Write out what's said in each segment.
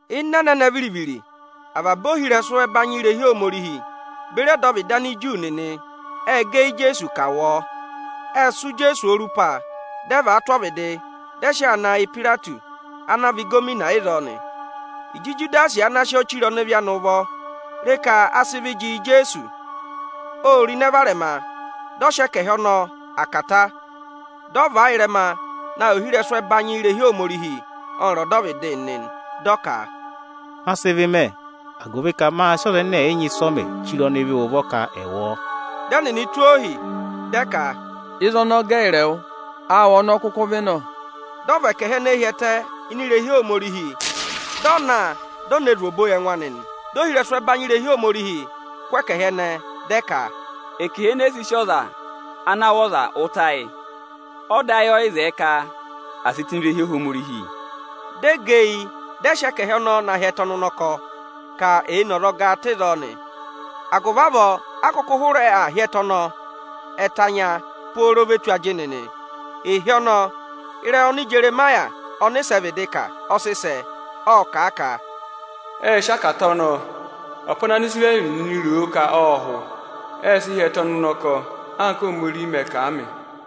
Ịnị ẹnẹnẹ viri-viri, avaba ohirẹsụ ẹbanyị irehi Ohomorihi beri ọdọvịdị Aniju nịnị ê gẹ eyi Ijeesu ka à wụ ọọ. Ệ sụ́ Ijeesu orupa, dị ẹ và a tụ́ ọvịdị, dị ẹ sị ọọ na yị Ipayireti ana vị ịgọvọnọ ịzọọ nị. Ịjị Ijudasi ana sị ọ chire ọnịvị anị ụvọ re ka a sị ịvị jị yị Ijeesu, ô ro ịnẹ varẹma, dị ọ sị ẹkẹhị ọnọọ, akata, dị ọ và a ịrẹma na yị ohirẹsụ ẹbanyị irehi Ohomorihi ọnịrị ọdọvịdị nịnị nị. Dị ọ ka, “Ma sị ịvị mẹ, agụvị ka mâ sị ọza ẹnẹ ẹ̀ yị nyị ịsị ọ mẹ chire ọnịvị ụvọ ka ẹ̀ wụ̀ ọọ.” Dị ẹnịnị tụ́ ohi, dị ẹ ka, “Ịzị ọnọọ gẹ ẹyịrị ẹwụ? Áawụ ọ́nọọ kụkụ vị nọ!” Dị ọ và ẹkẹhị ẹnẹẹ hi ẹtẹ ini irehi Ohomorihi, dị ọ na, di o ne zù obo yị ẹngụ anị nị. Dị ohirẹsụ ẹbanyị irehi Ohomorihi kụ́ ẹkẹhị ẹnẹẹ, dị ẹ ka, “Ẹkẹhị enee si sí ọza ana wụ̀ ọza ụta yị; ọda ayị ọ yị zẹẹ ka à sị tụ́ ini irehi Ohomorihi.” Dị ẹ gẹ eyi, dị ẹ sị ẹkẹhị ọnọọ na hị́ ẹtẹ ọnụnọkọ, ka èe ne azọgaa tụ́ ịzọọ nị. Agụvị avọọ a kụkụ hụrẹ aa hị́ ẹtẹ ọnọọ Ẹtẹ anya pooro ve tù ajịnị nị. Ịhị ọnọọ, ịrẹyị oni Ijeremaya ọnịsẹ vịdị kà ọ sị sẹ. Ộ kà a ka, “Ệ sị akata ọnọọ, ọpa ana Anisirẹrị nịnị ro ka ộ hụ; ệ sị hị́ ẹtẹ ọnụnọkọ, anka Óhomorihi mẹ̀ kà a mị.”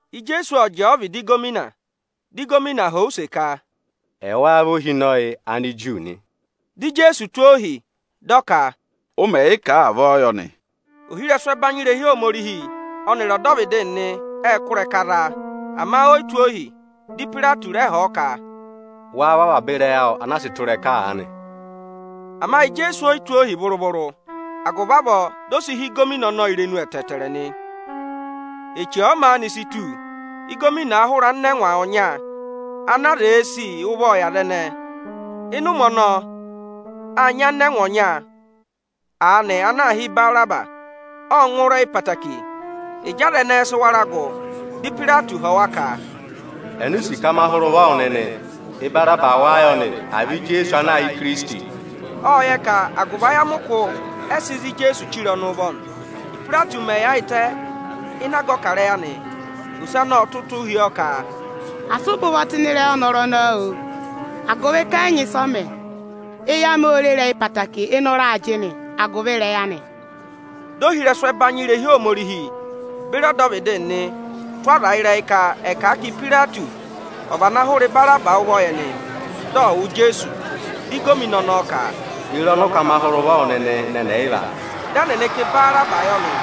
Ijeesu ộ jẹẹ ọvịdị ịgọvọnọ, di ịgọvọnọ họ̀ ọ use ka, “Ẹwáá vị ohinọyị Aniju nị?” Dị Ijeesu tụ́ ohi, dị ọ ka, “Ụ mẹ̀ yị kà a avọọ yọ nị.” Ohirẹsụ ẹbanyị irehi Ohomorihi ọnịrị ọdọvịdị nịnị ệ kụ́ ịrẹka za a, ama o yi tụ́ ohi. Dị Ipayireti rẹ họ̀ ọ ka, “Wáá wụ́ avaba ịrẹyị awụ anaa sị tụ́ ịrẹka aanị?” Ama Ijeesu o yi tụ́ ohi vụrụ-vụrụ; agụvị avọọ di o si hí ịgọvọnọ ọnọọ irenu ẹtẹẹtẹrẹ nị. Eche ọ̀ọ maanị si tù, ịgọvọnọ ọọ̄ hụrẹ anịnẹngwa ọnya ana aza èe sì ụvọọ yị aza ẹnẹẹ. Ịnị ụmẹ ọnọọ, â nyị anịnẹngwa ọnya aanị ana aā hị́ Ibaraba. Ộ ngụ ịrẹyị ẹtẹẹtẹrẹ. Ịjị aza ẹnẹẹ sị wara gụ, dị Ipayireti họ̀ wa ka, “Eni u sì ka ma hụrẹ ụvọ wụ nịnị, Ibaraba wáá yọ nị, à vị Ijeesu ana aā hị́ Ikirisiti?” Ộ yẹ ka agụvị ayamịkụ ẹ sị za Ijeesu chire ọnị ụvọ nị. Ípayireti mẹ̀ yaayịtẹ ịnị aga ọkarẹyị anị, ose anị ộ tụ́ ụtụ hi ọọ ka, “Asị ụ bẹ ụvọ tụ́ ịrẹyị ọnọrụ ọnọọ, oo, agụvị ka ẹ yị nyị ịsị ọ mẹ. Eyi amị ô re ịrẹyị ẹtẹẹtẹrẹ ịnị ụra ajịnị agụvị ịrẹyị anị.” Dị ohirẹsụ ẹbanyị irehi Ohomorihi beri ọdọvịdị nịnị tụ́ aza ịrẹyị ka ẹ̀ kà a ka Ipayireti ọ̀ vana hụrẹ Ibaraba ụvọ yị ẹnị, dị ọ̀ wụ Ijeesu nị. Dị ịgọvọnọ ọnọọ ka, “Ye re ọnị ụ ka ma hụrẹ ụvọ wụ nịnị ịnị ẹnị ẹyịva?” Dị ẹnịnị ka Ibaraba yọ nị.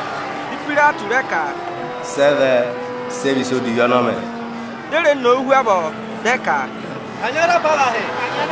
Dị Ipayireti rẹ ka, “Sị ẹ vẹ? Sị ẹ vị ịsa odivi ọnọọ mẹ?” Dị e re nowu hu avọọ, dị ẹ ka, “Kanyị ọọ za apavahị!”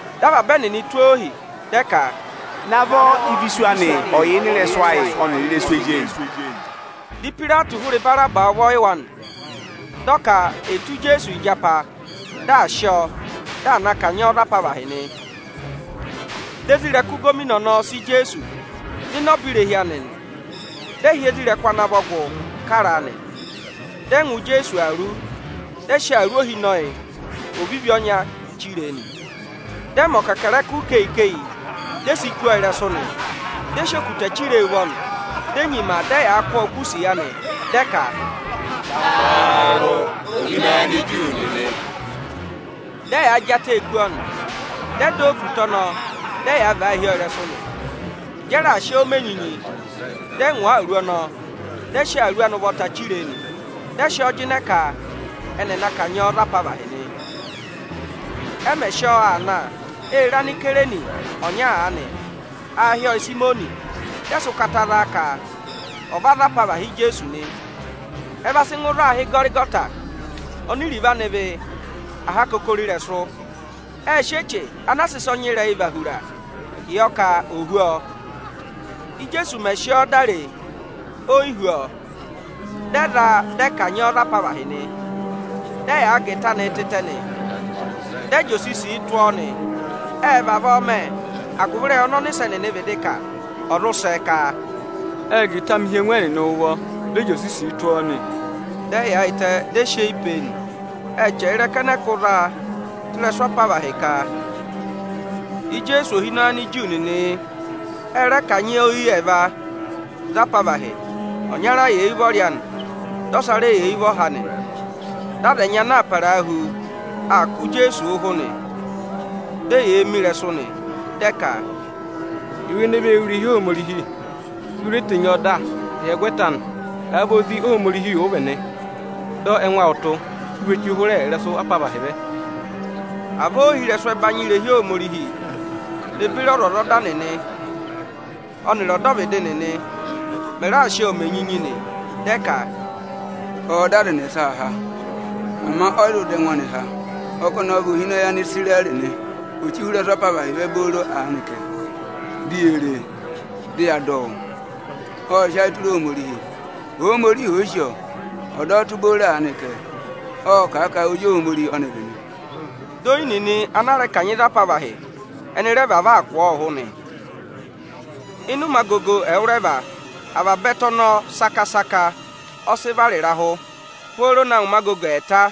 Dị avaba ẹnịnị tụ́ ohi, dị ẹ ka, “Naavọ, ịvị isu anị ọ̀ọ yà ịnị ịrẹsụ ayị ọnịrị ịrẹsụ ezi eyi!” Dị Ipayireti hụrẹ Ibaraba ụvọ yị wa nị. Dị ọ ka è tụ́ Ijeesu ịjapa, dị à sị ọọ, dị à na kanyị ọọ za apavahị nị. Dị isoja ịgọvọnọ ẹnẹẹ sị Ijeesu nọ ịnị ọba irehi anị nị, dị ẹ hị́ isoja nịnị ana vọ gụ kara a nị. Dị ẹ ngwa Ijeesu awuru, dị ẹ sị awuru ohinọyị ovivi ọnya chire e nị. Dị ẹ mẹ ọkẹkẹrẹkụ ikeyi-ikeyi, di e si kú ọọ ịrẹsụ nị. Dị ẹ sị okutẹ chire e ụvọ nị, di e nyima dị ẹyaa kụ́ ọọ ụkụ́ isiya nị, dị ẹ ka, “Taarụ, Ohinọyị Aniju nịnị.” Dị ẹyaa jị atẹẹ kú ọọ nị, dị ẹ dọ ọ okutẹ ọnọọ, dị ẹyaa vàa hi ọọ ịrẹsụ nị. Ịjị ẹ raà sị ọọ mẹ enyinyi, dị ẹ ngwa awuru ọnọọ, dị ẹ sị awuru anị ụvọta chire e nị. Dị ẹ sị ọọ jịnẹ ka ẹnị ẹ̀ na kanyị ọọ za apavahị nị. Ẹ mẹ̀ sị ọọ aa na, ê re Anisayireni ọnya aanị. Aā hị́ ọọ Ịsayịmọnị. Dị ẹ sị ụkata za a ka ọ̀ va za apavahị Ijeesu nị. Ịjị ẹ va sị ngụ ịzị aā hị́ Ịgọrịgọta, oni iruvo anị vị “Aha akokoro ịrẹsụ.” Ệ sị eche ana a sị ịsa ọnyịrẹyị và hura yọ ka ò hú ọọ. Íjeesu mẹ̀ sị ọọ dá ree, o yi hú ọọ. Dị ẹ za a, dị ẹ kanyị ọọ za apavahị nị. Dị ẹ gà ịta anị tịtẹ, dị ẹ jị osisi tụ́ ọọ nị. Ệ vavọọ mẹ, agụvị ịrẹyị ọnị ọnịsẹ nịnị vịdị kà, ọ̀ zụ sẹ ka, “Ệ gà ịta amị hi ẹngụ ẹnịnị ụvọ, dị ẹ jị osisii tụ́ ọọ nị.” Dị ẹ yaayịtẹ, dị ẹ sị eyi pe e nị. Ệ chẹrẹ ịrẹka ẹnẹẹ kụ́ za a tụ́ ịrẹsụ apavahị ka, “Ijeesu Ohinọyị Aniju nịnị yị.” Ẹ rẹ kanyị oyi ẹẹva za apavahị; ọnyara yà eyi ụvọrị anị, dị ọsa rẹ yà eyi ụvọha anị nị. Dị aza ẹnyị ana aa parahu aa kụ̀ Ijeesu ụhụ nị; dị eyee mi ịrẹsụ nị. Dị ẹ ka, “Ẹwụ ene vee wú irehi Ohomorihi, di u re tenyi ọọ dà ịhyẹgwẹta anị! Àa vị Ozi Ohomorihi ụ vị nị, dọ ẹngụ awụ tụ́, di u we chí hụụ ịrẹsụ apavahị vẹ!” Avọọ ohirẹsụ ẹbanyị irehi Ohomorihi ne beri ọzwọzọda nịnị ọnịrị ọdọvịdị nịnị mẹ̀ raa sị ọọ mẹ enyinyi nị. Dị ẹ ka: “Ọọ̄ dọ aza ẹnẹsa há, ama ọ yị zụ dọ ẹngụ anị há. Ọ kà ọnị ọ vị Ohinọyị Anisirẹrị nị; ò chí hụrẹ ịrẹsụ apavahị vẹ booro aanị kẹ, di yee re e, dị ya dọ ọ wụ́. Ộ sị ayị tụra Ohomorihi; Ohomorihi òo sì ọọ, ọ̀ dọ ọ tụ́ booro aanị kẹ! Ộ kà a ka Ozi Ohomorihi ọ́nị vị nị.” Dị oyi nịnị ana a rẹ kanyị za apavahị ẹnị rẹ vavọọ aa kụ̀ ọọ ụhụ nị. Ịnị ụmẹ agogo ẹwụrẹva, avaba ẹtẹ ọnọọ saka-saka ọ sị vara ịrahụ, pooro na ngụ ụmẹ agogo ẹẹta.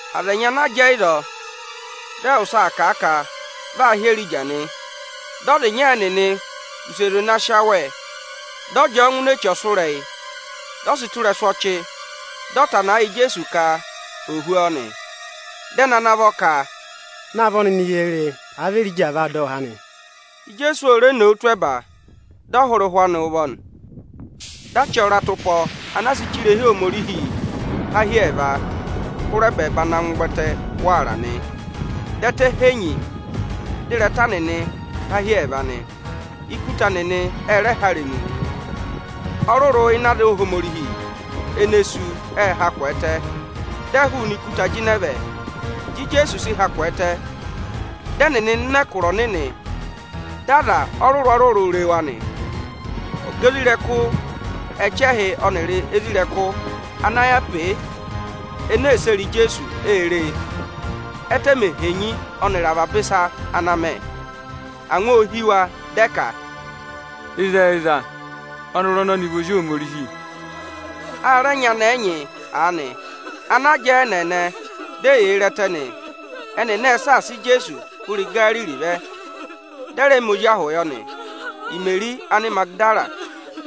Aza ẹnyị ana jẹẹ ịzọọ, dị ẹ wụ́, ệ kà a ka vị aa hị́ Erija nị. Dị ọza ịnya ẹnịnị wuse zwe na sị awẹ, dị ọ jị ọọ ngụ ini eche ọsụrẹyị, dị ọ sị tụ́ ịrẹsụ ọchị, dị ọ tana ẹ yị Ijeesu ka ò hú ọọ nị. Dị ẹnị ana vọ ka, “Naavọ nịnị ye re e, àa vị Erija aa vaa dọ ọ há nị!” Ijeesu o re nowu tụ́ ẹba, dị ọ hụrẹ ụhwẹ anị ụvọ nị. Dị achị ọratụpọ anaa sị che irehi Ohomorihi, há hi ẹẹva hụrẹ ẹbẹẹba na ngụ ụvẹtẹ waara nị. Dị ẹtẹ henyi, dị ịrẹta nịnị há hi ẹẹva nị. Ikuta nịnị ệ há irenu, ọrụrụ ịnị aza Ohomorihi ene sú, ệ ha kwẹẹtẹ, dị ẹ hụụnị ikuta jịnẹ vẹ, Ịjị Ijeesu sị ha kwẹẹtẹ; dị ẹnịnị nọ ịnị ẹkụra ọnịnị, dị aza ọrụrụ-ọrụrụ re wa nị. Ọga isoja ẹchẹhị nịnị ọnịrị isoja nịnị ana yà pe e ene ee sere Ijeesu, ê re, ẹ́tẹ mè henyi ọnịrị avaba ịsa ana mẹ. Angwa ô hí wa, dị ẹ ka, “Ịzẹyịza, ọnọrụ ọnọnị vị Ozi Ohomorihi o!” A rẹ nyị anẹẹ ẹnyị aanị ana jẹẹ ẹ́nẹẹnẹ, di eyee re ẹtẹ nị. Ẹnịnị ệ saasa Ijeesu hụrẹ Igariri vẹ, ka ẹnị ẹ̀ va gụ ọ ụvọ. Imeri Anịmagịdara,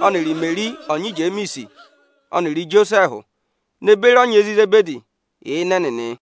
ọnịrị Imeri ọnyị Ijemiisi ọnịrị Ijosẹẹhụ, ne beri ọnyị ezi Izebedi yà ịnị ẹnịnị.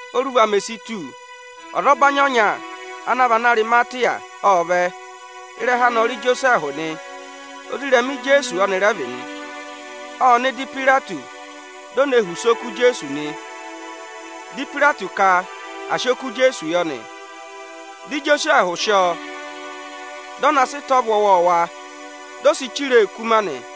Óruva mè si tù, ọzọbanyị ọnya ana vị Anarịmatịya ộ vẹ. Ịrẹha anị ọ rị Ijosẹẹhụ nị, ozirẹma Ijeesu ọnị rẹ vị nị. Ộ nọ ịdị Ipayireti, di o ne họ̀ use oku Ijeesu nị. Dị Ipayireti ka à sị oku Ijeesu yọ nị. Dị Ijosẹẹhụ sị ọọ, dị ọ na sị ịta ọvụ ọwọọwa, di o si chire e ikuma nị.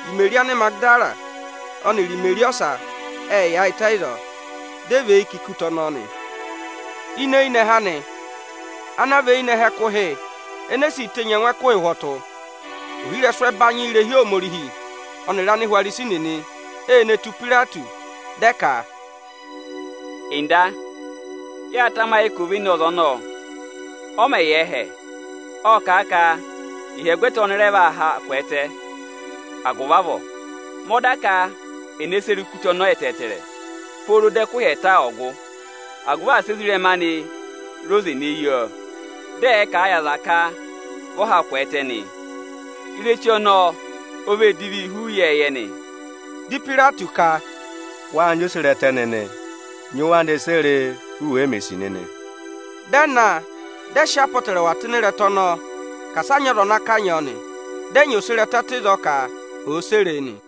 Imeri Anịmagịdara ọnịrị Imeri ọsa ệ yaayịtẹ ịzọọ, dị ẹ và eyi kà ikuta ọnọọ nị. Ini eyinẹhẹ anị, ana vị eyinẹhẹ ẹkụhị enee si tenyi ẹngụ ẹkụhị ụhwọtụ, ohirẹsụ ẹbanyị irehi Ohomorihi ọnịrị Anihwarisi nịnị e ne tù Ipayireti. Dị ẹ ka, “Ọga, yâ tamayị ka ovenọza ọnọọ mẹ̀ yà ẹhẹ, ộ kà a ka ịhyẹgwẹta ọnị ọnị sú, ọnị rẹ vaa haa kwẹẹtẹ.” Agụvị avọọ, mẹ ọda ka è ne sere ikuta ọnọọ ẹtẹẹtẹrẹ pooro dị ẹkụhị ẹẹta ọ̀ gụ, agụvị asị ezirẹma anị re oze ne yi ọọ, dị ẹ̀ẹ kà a yị aza ka vị ọ ha kwẹẹtẹ nị. Ireche ọnọọ o vee divii hu ị́ịyẹẹyẹ nị. Dị Ipayireti ka, “Wâ nyị oserẹtẹ nịnị, nyị wa ne sere e, u wèe mè sì nịnị!” Dị ẹ na, dị ẹ sị apọtẹrẹwa tụ́ ịnị ịrẹta ọnọọ ka asa a nyị ọza ana kanyị ọọ nị. Dị ẹ nyị oserẹtẹ tụ́ ịzọọ ka òo sere e nị.